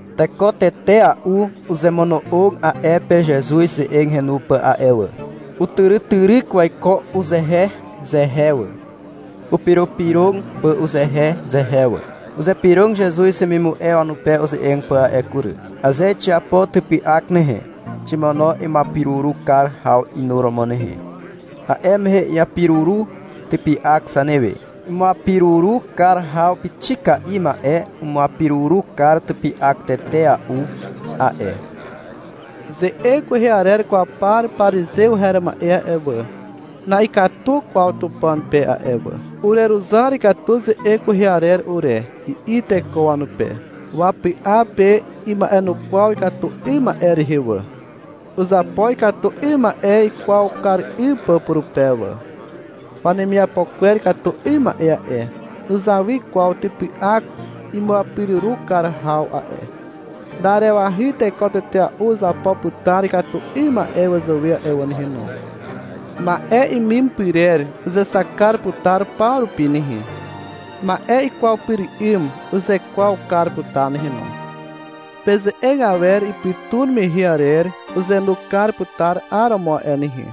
Teko tetea'u uzemono'og a'e pe Zezuz ze'eg henu pà a'e wà. Utyrytyryk waiko uzehezehe wà, upyropyrog pà uzehezehe wà. Uzypyrog Zezuz wemimu'e wanupe uze'eg pà a'e kury. — Aze xiapo typy'ak nehe, ximono imuapiruru kar haw inuromo nehe. A'e mehe iapiruru typy'ak zanewe. Imuapiruru kar haw pixika'i ma'e umuapiruru kar typy'ak tetea'u a'e. Ze'eg kwehe arer kwaw par parizew her ma'e a'e wà, na'ikatu kwaw Tupàn pe a'e wà. — Ureruzar katu ze'eg kwehe arer ure, i'i teko wanupe. Wapy'a pe ima'enukwaw ikatu 'ym ma'e rehe wà. Uzapo ikatu 'ym ma'e ikwaw kar 'ym pà purupe wà. Wanemiapo kwer ikatu 'ym ma'e a'e, nuzawy kwaw typy'ak imuapiruru kar haw a'e. Na'arewahy teko tetea'u uzapo putar ikatu 'ym ma'e wazàwe a'e wà nehe no. Ma'e imim pyrer uzexak kar putar paw rupi nehe. Ma'e ikwaw pyr 'ym uzekwaw kar putar nehe no. Peze'eg awer ipytun mehe arer uzenu kar putar 'ar romo a'e nehe.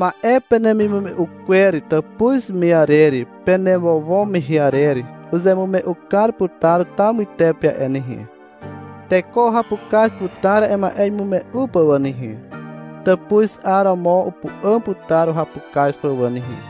Ma'e penemimume'u kwer tàpuz me arer penewowo mehe arer uzemume'u kar putar taw mytepe a'e nehe. Teko uhapukaz putar a'e ma'e imume'u pà wà nehe, tàpuz 'aromo upu'àm putar uhapukaz pà wà nehe.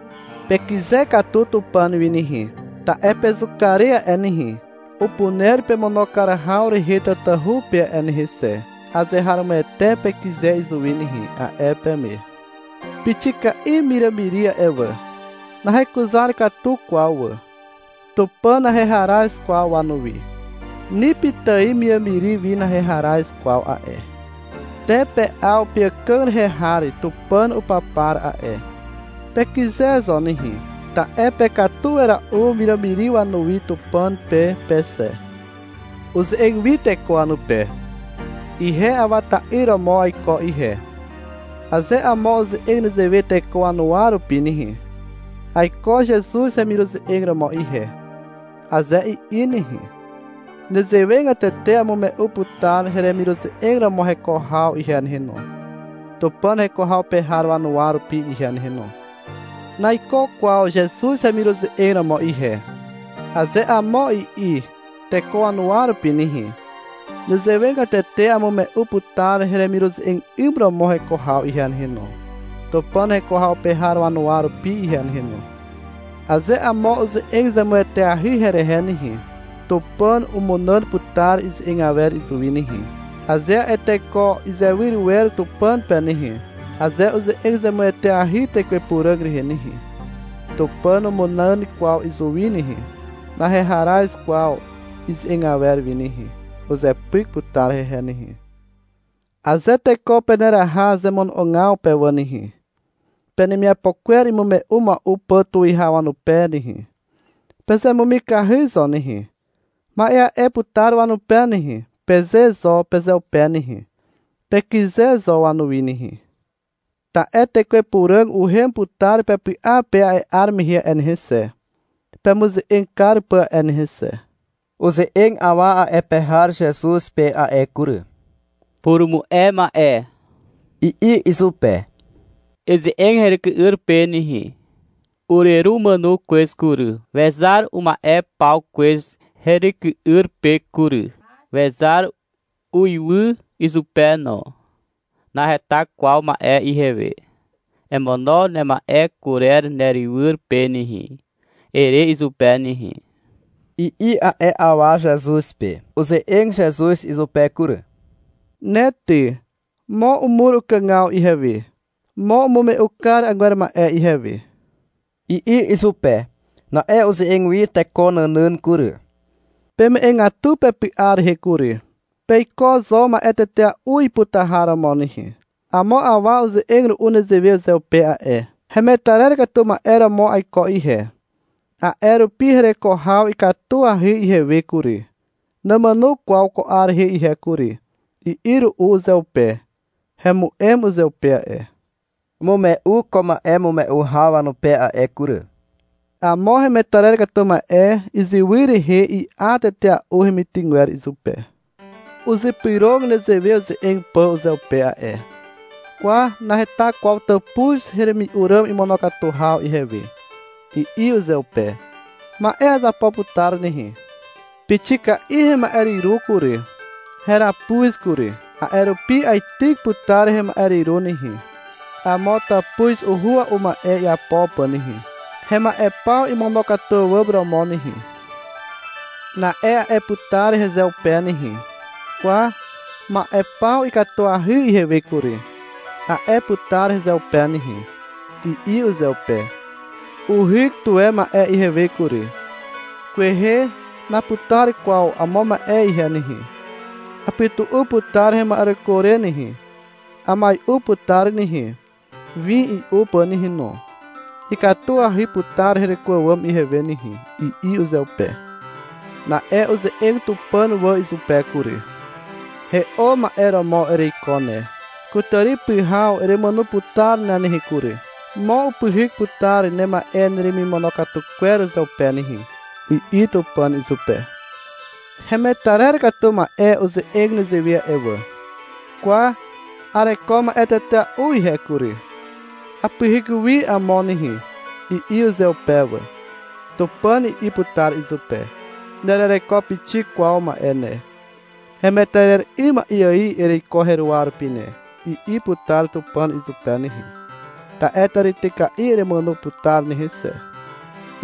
Pekyze katu Tupàn wi nehe, ta'e pezuka re a'e nehe, upuner pemono kar haw rehe tatahu pe a'e nehe xe. Azeharomoete pekyze izuwi nehe, a'e peme. Pixika'i wiràmiri a'e wà. Nahekuzar katu kwaw wà. Tupàn naheharaz kwaw wanuwi. Ni pitài wiràmiri wi naheharaz kwaw a'e. Te pe'aw peàkàg rehe har Tupàn upapar a'e. Pekyze zo nehe, ta'e pekatu wera'u wiràmiri wanuwi Tupàn pe pe xe. Uze'eg wi teko wanupe. — Ihe Awa ta'yr romo aiko ihe. Aze amo uze'eg nezewe teko wanuwa rupi nehe, — Aiko Zezuz hemiruze'eg romo ihe, aze i'i nehe, nezewegatete amume'u putar heremiruze'eg romo heko haw ihe nehe no, Tupàn heko haw pe har wanuwa rupi ihe nehe no. — Naiko kwaw Zezuz hemiruze'eg romo ihe, aze amo i'i teko wanuwa rupi nehe, nezewegatete amume'u putar heremiruze'eg 'ym romo heko haw ihe nehe no, Tupàn heko haw pe har wanuwa rupi ihe nehe no. Aze amo uze'eg zemueteahy herehe nehe, Tupàn umunàn putar ize'eg awer izuwi nehe, aze a'e teko izewyr wer Tupàn pe nehe. Aze uze'eg zemueteahy Tekwe Puràg rehe nehe, Tupàn numunàn kwaw izuwi nehe. Naheharaz kwaw ize'eg awer wi nehe. Uzepyk putar hehe nehe. Aze teko peneraha zemono'ogaw pe wà nehe, penemiapo kwer imume'u mua'u pà tuwihaw wanupe nehe, pezemumikahy zo nehe. — Ma'e a'e putar wanupe nehe, peze zo pezeupe nehe. Pekyze zo wanuwi nehe. Ta'e Tekwe Puràg uhem putar pepy'a pe a'e 'ar mehe a'e nehe xe, pemuze'eg kar pà a'e nehe xe. Uze'eg awa a'e pe har Zezuz pe a'e kury. — Purumu'e ma'e, i'i izupe. — Eze'eg heryky'yr pe nehe. Ureru umàno kwez kury. Wezar uma'e paw kwez heryky'yr pe kury. Wezar uiwy izupe no. Naheta kwaw ma'e ihewe. — Emono nema'e kurer nerywyr pe nehe, ere izupe nehe, i'i a'e awa Zezuz pe. Uze'eg Zezuz izupe kury. — Ne ty, mo umur ukàgaw ihewe, mo umume'u kar agwer ma'e ihewe, i'i izupe. Na'e uze'eg wi teko nànàn kury. — Peme'egatu pepy'a rehe kury. Peiko zo ma'e tetea'u iputar har romo nehe. Amo awa uze'eg ru'u nezewe uzeupe a'e. — Hemetarer katu ma'e romo aiko ihe, a'e rupi hereko haw ikatuahy ihewe kury. Namàno kwaw ko 'ar rehe ihe kury, i'i ru'u uzeupe. Hemu'em uzeupe a'e. Umume'u ko ma'emume'u haw wanupe a'e kury. — Amo hemetarer katu ma'e iziwy rehe i'a tetea'u hemitygwer izupe. Uzypyrog nezewe uze'eg pà uzeupe a'e. — Kwa, naheta kwaw tàpuz heremi'u ràm imonokatu haw ihewe, i'i uzeupe. — Ma'e azapo putar nehe. Pixika'i hema'e hyru kury, heràpuz kury. A'e rupi aityk putar hema'e hyru nehe, amo tàpuz uhua'u ma'e iapo pà nehe, hema'e paw imonokatu àwàm romo nehe. Na'e a'e putar hezeupe nehe. — Kwa, ma'e paw ikatuahy ihewe kury, a'e putar hezeupe nehe, i'i uzeupe. — Uhyk tuwe ma'e ihewe kury. Kwehe naputar kwaw amo ma'e ihe nehe. Apytu'u putar hema'ereko re nehe. Amai'u putar nehe, win i'u pà nehe no, ikatuahy putar hereko àwàm ihewe nehe, i'i uzeupe. Na'e uze'eg Tupàn wà izupe kury. — He'o ma'e romo ereiko ne. Kutàri pyhaw eremàno putar nehe kury. Mo upyhyk putar nema'e neremimonokatu kwer uzeupe nehe, i'i Tupàn izupe. — Hemetarer katu ma'e uze'eg nezewe a'e wà. — Kwa, areko ma'e tetea'u ihe kury. Apyhyk wi amo nehe, i'i uzeupe wà. Tupàn i'i putar izupe. — Nerereko pixik kwaw ma'e ne. Hemetarer 'ym ma'e ài ereiko heruwa rupi ne, i'i putar Tupàn izupe nehe. — Ta'e tàrityka'i eremàno putar nehe xe,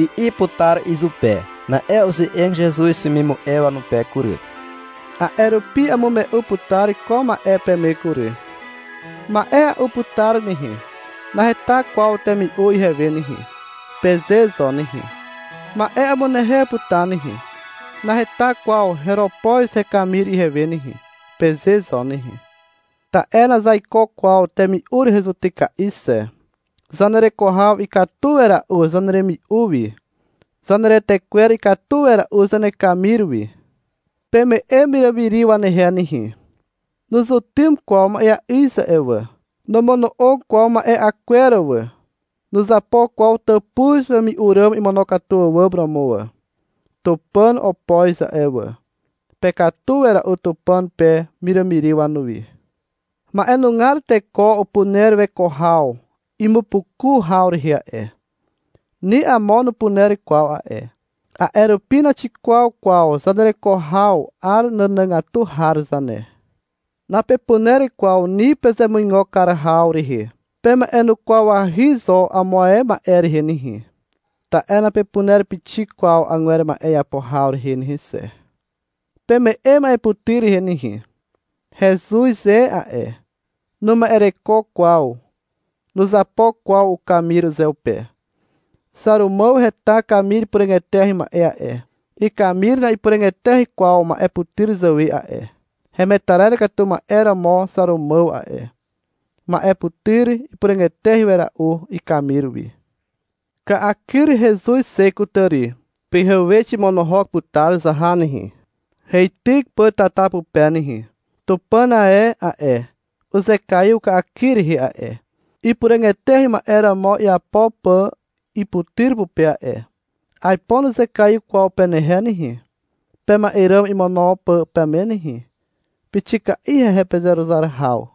i'i putar izupe. Na'e uze'eg Zezuz wemimu'e wanupe kury. — A'e rupi amume'u putar ko ma'e peme kury. — Ma'e a'u putar nehe. Naheta kwaw temi'u ihewe nehe, peze zo nehe. — Ma'e amunehew putar nehe. Naheta kwaw heropoz hekamir ihewe nehe, peze zo nehe. Ta'e nazaiko kwaw temi'u rehe zutyka'i xe. Zanereko haw ikatu wera'u zaneremi'u wi. Zaneretekwer ikatu wera'u zanekamir wi. Peme'e wiràmiri wanehe nehe. Nuzutym kwaw ma'eà'yz a'e wà. Nomono'og kwaw ma'e'a kwer wà. Nuzapo kwaw tàpuz wemi'u ràm imonokatu àwàm romo wà. Tupàn opoz a'e wà. Pekatu wera'u Tupàn pe wiràmiri wanuwi. Ma'enugar teko upuner weko haw imupukua'u haw rehe a'e. Ni amo nupuner kwaw a'e. A'e rupi naxikwaw kwaw zanereko haw 'ar nànàgatu har zane. Napepuner kwaw ni pezemuigo kar haw rehe. Pema'enukwawahy zo amo ae ma'e rehe nehe. Ta'e napepuner pixik kwaw agwer ma'e iapo haw rehe nehe xe. Peme'e ma'eputyr rehe nehe. Hezuz e a'e. Numa'ereko kwaw. Nuzapo kwaw ukamir uzeupe. Xàrumàw heta kamir ipuràg eteahy ma'e a'e. Ikamir na'ipuràg eteahy kwaw ma'e putyr zàwe a'e. Hemetarer katu ma'e romo Xàrumàw a'e. Ma'e putyr ipuràg eteahy wera'u ikamir wi. Ka'akyr hezuz xe kutàri. Pyhewe ximonohok putar zaha nehe, heityk pà tata pupe nehe. Tupàn ae a'e, uzekaiw ka'akyr rehe a'e, ipuràg eteahy ma'e romo iapo pà iputyr pupe a'e. Aipo nuzekaiw kwaw penehe nehe, pema'e ràm imono pà peme nehe. Pixika'i hehe pezeruzar haw.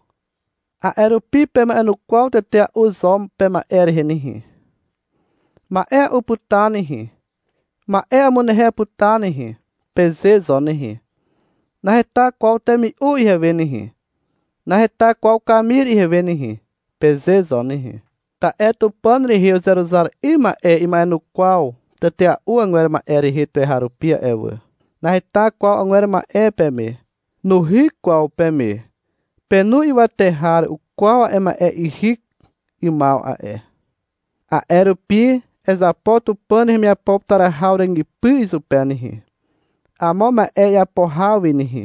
A'e rupi pema'enukwaw tetea'u zo pema'e rehe nehe. — Ma'e a'u putar nehe, ma'e amunehew putar nehe, peze zo nehe. — Naheta kwaw temi'u ihewe nehe, naheta kwaw kamir ihewe nehe, peze zo nehe. Ta'e Tupàn rehe uzeruzar 'ym ma'e ima'enukwaw tetea'u agwer ma'e rehe tuweharupi a'e wà. Naheta kwaw agwer ma'e peme. Nuhyk kwaw peme. Penu ywate har ukwaw a'e ma'e ihyk 'ymaw a'e. A'e rupi, ezapo Tupàn hemiapo putar haw ràgypy izupe nehe, amo ma'e iapo haw wi nehe,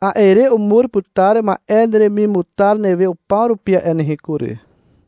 a'e re umur putar ma'e neremimutar newe upaw rupi a'e nehe kury.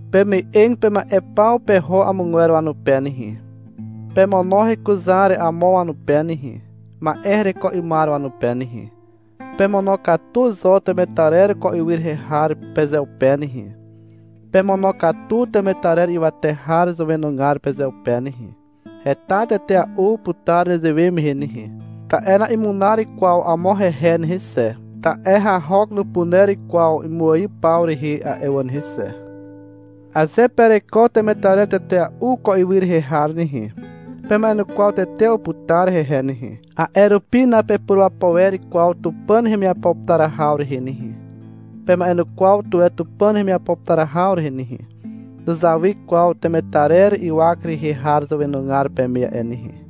Peme'eg pema'e paw peho amogwer wanupe nehe. Pemono hekuzar amo wanupe nehe, ma'e hereko 'ymar wanupe nehe. Pemonokatu zo temetarer ko ywy rehe har pezeupe nehe. Pemonokatu temetarer ywate har zàwenugar pezeupe nehe. Heta tetea'u putar nezewe mehe nehe, ta'e na'imunar kwaw amo hehe nehe xe, ta'e hahok nupuner kwaw imuaiw paw rehe a'e wà nehe xe. Aze pereko temetarer tetea'u ko ywy rehe nehe, pema'enukwaw tetea'u putar hehe nehe. A'e rupi napepurapo wer kwaw Tupàn hemiapo putar haw rehe nehe. Pema'enukwaw tuwe Tupàn hemiapo putar haw rehe nehe. Nuzawy kwaw temetarer ywak rehe har zàwenugar peme a'e nehe.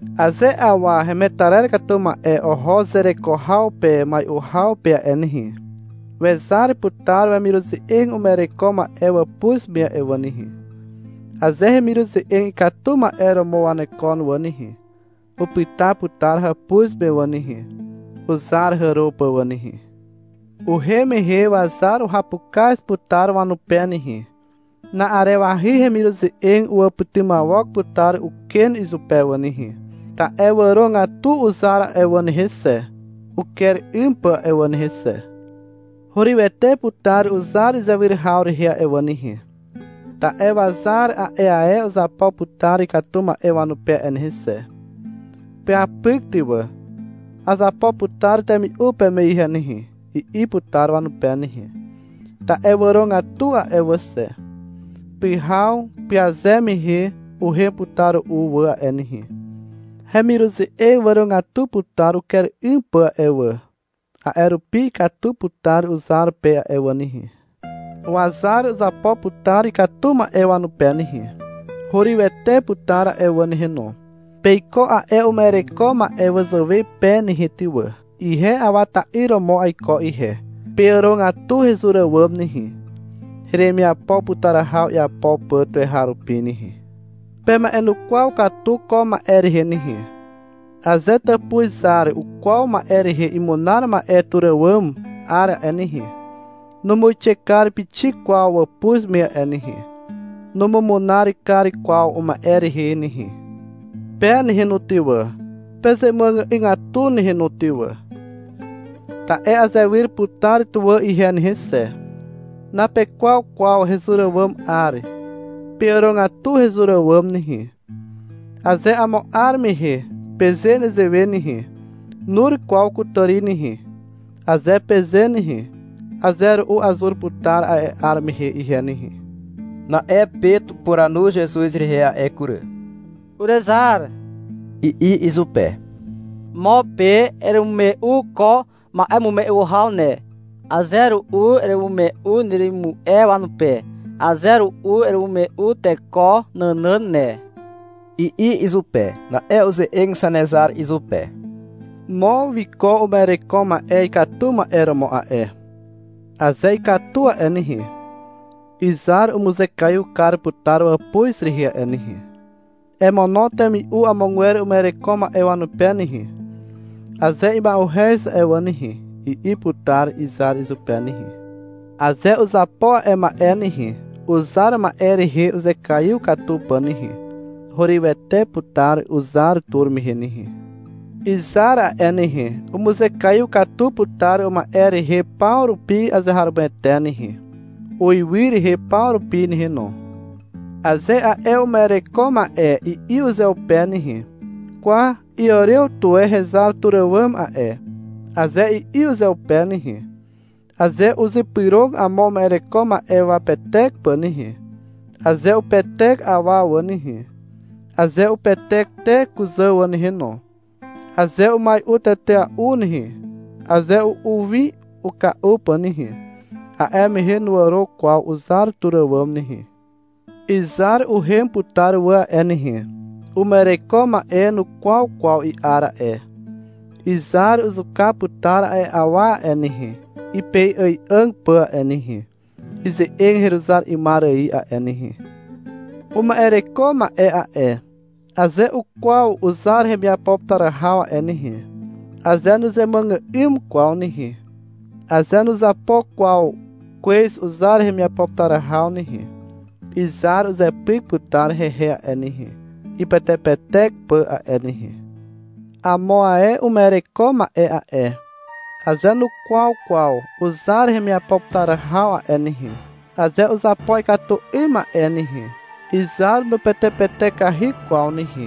Aze awa hemetarer katu ma'e oho zereko haw pe mai'u haw pe a'e nehe, wezar putar wemiruze'eg uma'ereko ma'e wàpuz me a'e wà nehe. Aze hemiruze'eg ikatu ma'e romo wanekon wà nehe, upyta putar hàpuz me wà nehe, uzar hàro pà wà nehe. Uhem mehe wazar uhapukaz putar wanupe nehe. Na'arewahy hemiruze'eg uwàpytymawok putar uken izupe wà nehe, ta'e wàrogatu uzar a'e wà nehe xe, uker 'ym pà a'e wà nehe xe. Hurywete putar uzar izewyr haw rehe a'e wà nehe, ta'e wazar a'e ae uzapo putar ikatu ma'e wanupe a'e nehe xe. -Peapyk ty wà, azapo putar temi'u peme ihe nehe, i'i putar wanupe nehe, ta'e wàrogatu a'e wà xe. Pyhaw pyaze mehe uhem putar ru'u wà a'e nehe. Hemiruze'eg wàrogatu putar uker 'ym pà a'e wà. A'e rupi ikatu putar uzar pe a'e wà nehe. Wazar uzapo putar ikatu ma'e wanupe nehe. Hurywete putar a'e wà nehe no. Peiko a'e uma'ereko ma'e wazàwe pe nehe ty wà. Ihe Awa ta'yr romo aiko ihe. Peàrogatu hezur àwàm nehe, heremiapo putar haw iapo pà tuweharupi nehe. Pema'enukwaw katu ko ma'e rehe nehe. Aze tàpuz zar ukwaw ma'e rehe imunar ma'e tur àwàm 'ar a'e nehe, numuixe kar pixik kwaw wàpuz me a'e nehe. Numumunar kar kwaw uma'e rehe nehe. Pe nehe no ty wà, pezemuàgy'ygatu nehe no ty wà, ta'e azewyr putar tuwà ihe nehe xe. Napekwaw kwaw hezur àwàm 'ar. Peàrogatu hezur àwàm nehe. Aze amo 'ar mehe peze nezewe nehe. — Nur kwaw kutàri nehe, aze peze nehe, aze ru'u azur putar a'e 'ar mehe ihe nehe. Na'e Pet upuranu Zezuz rehe a'e kury. — Urezar, i'i izupe. — Mo pe eremume'u ko ma'emume'u haw ne. Aze ru'u eremume'u neremimu'e wanupe. Aze ru'u eremume'u teko nànàn ne, i'i izupe. Na'e uze'eg Zanezar izupe. — Mo wiko uma'ereko ma'e ikatu ma'e romo a'e. Aze ikatu a'e nehe, izar umuzekaiw kar putar wàpuz rehe a'e nehe. — Emono temi'u amogwer uma'ereko ma'e wanupe nehe, aze ima'uhez a'e wà nehe, i'i putar izar izupe nehe. Aze uzapo a'e ma'e nehe, uzar ma'e rehe uzekaiw katu pà nehe, hurywete putar uzar tur mehe nehe. Izar a'e nehe, umuzekaiw kar putar uma'e rehe paw rupi azeharomoete nehe, uiwy rehe paw rupi nehe no. Aze a'e uma'ereko ma'e i'i uzeupe nehe: Kwa, iàrew tuwe hezar tur àwàm a'e, aze i'i uzeupe nehe, aze uzypyrog amo uma'ereko ma'e wapetek pà nehe, aze upetek awa wà nehe, aze upetek te kuzà wà nehe no, aze umai'u tetea'u nehe, aze u'u win uka'u pà nehe, a'e mehe nuàro kwaw uzar tur àwàm nehe. Izar uhem putar wà a'e nehe. Uma'ereko ma'e nukwaw kwaw i'ar a'e. Izar uzuka putar a'e awa a'e nehe, ipei'ài'àg pà a'e nehe, ize'eg heruzar 'ymar ài a'e nehe. Uma'ereko ma'e a'e, aze ukwaw uzar hemiapo putar haw a'e nehe, aze nuzemuàgà'ym kwaw nehe, aze nuzapo kwaw kwez uzar hemiapo putar haw nehe, izar uzepyk putar hehe a'e nehe, ipetepetek pà a'e nehe. Amo ae uma'ereko ma'e a'e, aze nukwaw kwaw uzar hemiapo putar haw a'e nehe, aze uzapo ikatu 'ym ma'e nehe, izar nupetepetekahy kwaw nehe.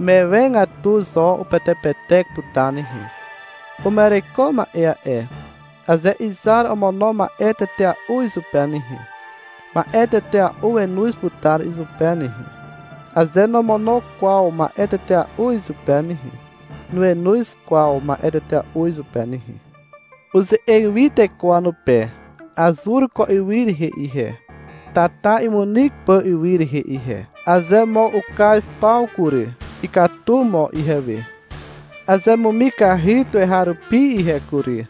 Mewe katu zo upetepetek putar nehe. Uma'ereko ma'e a'e, aze izar omono ma'e tetea'u izupe nehe, ma'e tetea'u wenoz putar izupe nehe. Aze nomono kwaw ma'e tetea'u izupe nehe. Nuenoz kwaw ma'e tetea'u izupe nehe. Uze'eg wi teko wanupe. Azur ko ywy rehe ihe, tata imunyk pà ywy rehe ihe. Aze mo ukaz paw kury, ikatu mo ihewe. Azemumikahy tuweharupi ihe kury,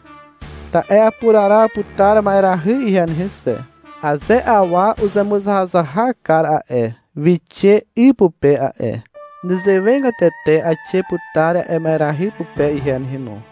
ta'e apuraraw putar ma'erahy ihe nehe xe. Aze awa uzemuzahazahak kar a'e, wixe 'y pupe a'e. Nezewegatete aixe putar a'e ma'erahy pupe ihe nehe no.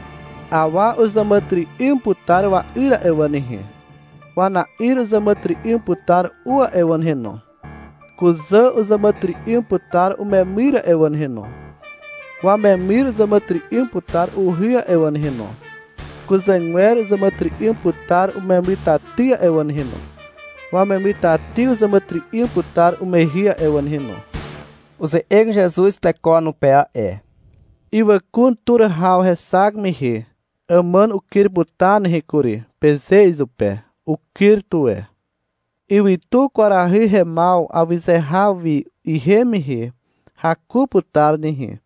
Awa uzàmàtyry'ym putar wa'yr a'e wà nehe. Wana'yr uzàmàtyry'ym putar u a'e wà nehe no. Kuzà uzàmàtyry'ym putar umemyr a'e wà nehe no. Wamemyr uzàmàtyry'ym putar uhy a'e wà nehe no. Kuzàgwer uzàmàtyry'ym putar umemytaty a'e wà nehe no. Wamemytaty uzàmàtyry'ym putar umehy a'e wà nehe no. Uze'eg Zezuz teko wanupe a'e. — Ywàkun tur haw hexak mehe, — Àmàn ukyr putar nehe kury, peze izupe. Ukyr tuwe. Ywytu kwarahy hemaw awyze haw wi ihem mehe, — Haku putar nehe,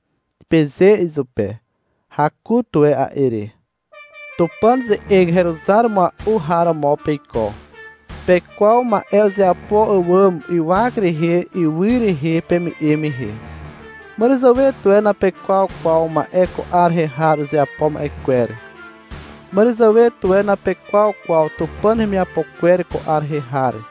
peze izupe. Haku tuwe a'e re. Tupàn ze'eg heruzar mua'u har romo peiko. Pekwaw ma'e uzeapo àwàm ywak rehe ywy rehe peme'e mehe. Màràzàwe tuwe napekwaw kwaw ma'e ko 'ar rehe har uzeapo ma'e kwer. Màràzàwe tuwe napekwaw kwaw Tupàn hemiapo kwer ko 'ar rehe har.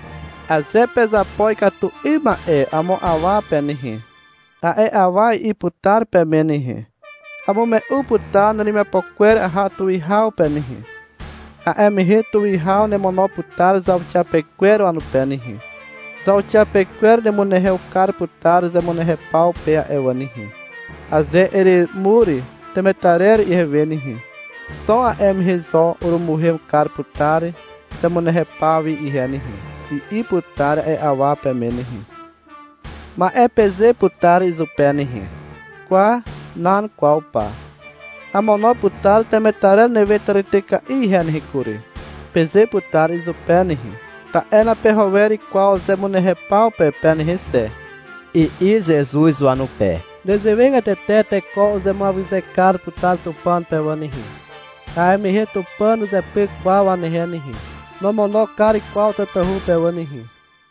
Aze pezapo ikatu 'ym ma'e amo awa pe nehe, a'e awa i'i putar peme nehe, Amume'u putar neremiapo kwer aha tuwihaw pe nehe. A'e mehe tuwihaw nemono putar zauxiapekwer wanupe nehe. Zauxiapekwer nemunehew kar putar zemunehew paw pe a'e wà nehe. — Aze eremur temetarer ihewe nehe, xo a'e mehe zo urumuhem kar putar zemunehew paw wi ihe nehe, i'i putar a'e awa peme nehe. Ma'e peze putar izupe nehe. Kwa, nan kwaw pa, amono putar temetarer newe tàrityka'i ihe nehe kury, peze putar izupe nehe, ta'e napeho wer kwaw zemunehew paw pe nehe xe, i'i Zezuz wanupe. (Nezewegatete teko uzemuawyze kar putar Tupàn pe wà nehe. A'e mehe Tupàn nuzepyk kwaw wanehe nehe. Nomono kar kwaw tatahu pe wà nehe.)